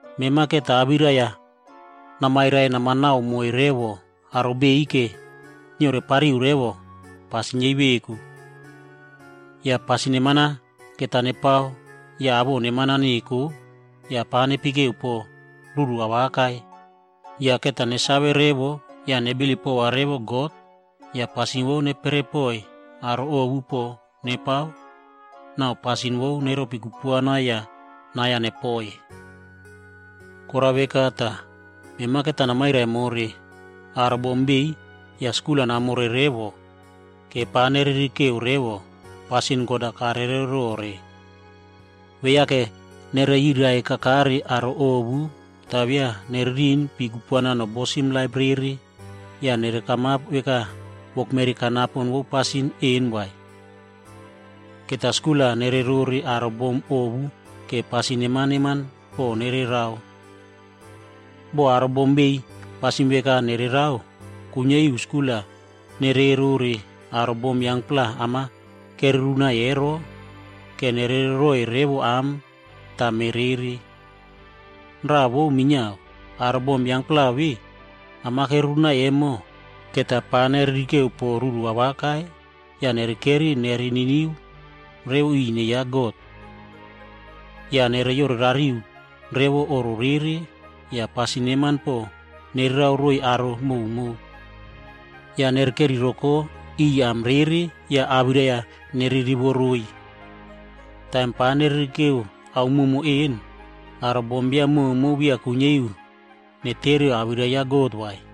Mema va awirai-a namairai namanao moiy revo aro biꞌiy vora neorepapi revo pasin yei veku. Yah pasin neman-a va nepao yah awoꞌo neman-a neko, yah pava nepekeu pon ruru awaka. Yah va nesave revo yah nebilip pova revo God, yah pasin vo neperepoiy aro ovu pon nepao, yah pasin vo neropi kupuana yah nai-a nepoi. Korao veka tah va namairai more aro bom biꞌiy yah skul-a namore vora, pa nererekeu revo pasin God-a karerero. Beya pianererari rore aro ovu tah beya nererin pi kupuana nobosim laip rere yah beya neriave wokmeri kanapo vo pasin vemona vai. Va skul-a nererore aro bom ovu vora pasin neman neman pon nererao. Boh pasin veka ve nererao, kuiniari nereskulim rere aro bom yangpla am-a kererunai ero, vora nererereroiy revo am tah me rere. Raꞌa vo minia, aro bom yangpla vemona am-a kerunaiy emo va pa nererekeu pon ruru awaka, yah nerekeri nereniniu revo ri ine ya God. Yah neyorerari revo oꞌro rere, yah pasin neman pon nererao roiy aro koka. Yah nereikeri roko am rere yah ava nererivo roiy. Taim pa nererekere ao koka vemona, aro bombiam koka beya kuiniari netereu awirai ya God vai.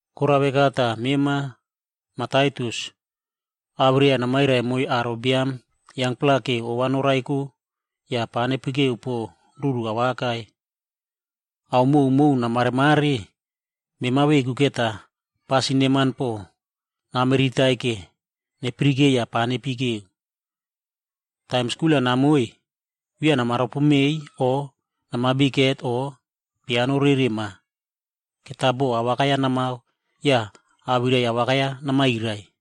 Korao veka tah mema Mah Taitus, awirai-a namairai naiy aro biam yangpla vora ova noraiko yah pava nepekeu pon ruru awaka. Ao koka kamaremare, mema veku va pasin neman pon namiritai vora neyara yah pava nepekeu. Taim skul-a namoiy, beya nama ropomeiy o nama bikhet o pianorerema vai. Va boꞌo awaka namao yah awirai awaka namairai.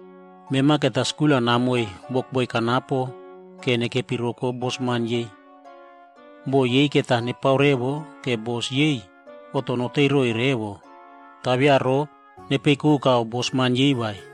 Mema va skul-a namoiy wokboi kanapo vora nepeikepi roko bosman yei. Boꞌo yei va nepao revo vora bos yei kuiniari oꞌto noteiy roiy revo. Tah beya rova nepeikoka bosman vai.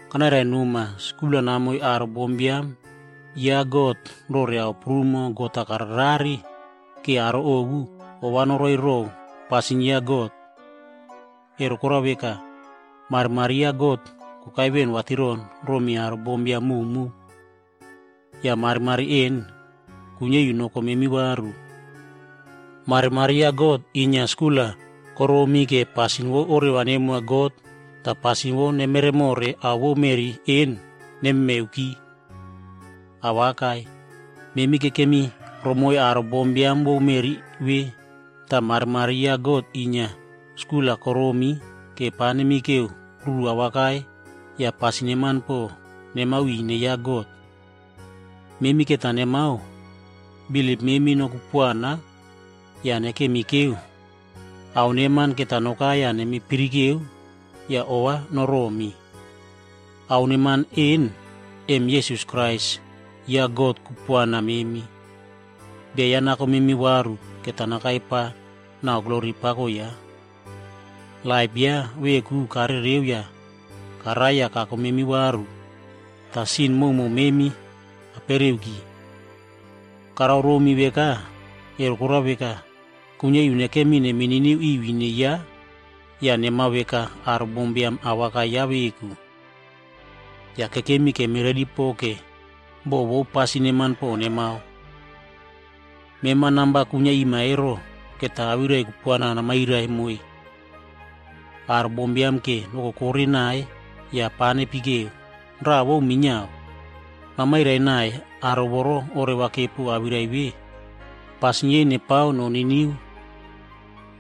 Kanairai noma va skul-a namoiy aro bombiam ya God rore ao koka God-a kararerare, vora aro bombiam ovu ova noroiy. Ku vo korao veka, marimari ya God, yake kokai roiy veꞌen aro prumo vatiron. Yah kuiniari noko memi varu. Marimari ya God inia skul-a koromi vora pasin vo oreva nemoa God tah pasin vo nemeremore ao vo meꞌri vemona nememeuki. Awaka, memi kekemi romoiy aro bombiam vo meꞌri vemona, tah marimari ya God inia skul-a koromi vora pa nemekeu ruru neman yah pasin neman pon nemao mi ine ya God. Yah memi va nemao bilip memi nokupuana yah nekemi kekeu ao neman va nokai yah nemipirike yah ova noromi. Ao neman vemona kekemi kekeu emo, em Jisas Krais God kupuana memi. Bia ya nako memi varu va nakai pa re glori pako ya. Laip ya veku karereuki yah karai tah kako memi varu yah sin koka memi kapereuki. Ao ve karao romi emo, ku vo korao veka, kuiniari nekemi nemininiu ri ine ya tah nemave aro bombiam ya veku. Yah kekemi kemiredi pon more boꞌo vo pasin neman pon va nemao. Mema va namba ve kwinia rima namayusim yah awirai kupuana namairai naiy aro bombiam vora nokokore naiy yah pava nepekeu. Raꞌa vo minia, namairai naiy aro voro oreva kepo awirai vemona, vora pasin yei nestretim.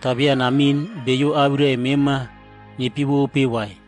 Tah beya namin beyo awirai mema nepiewope vai.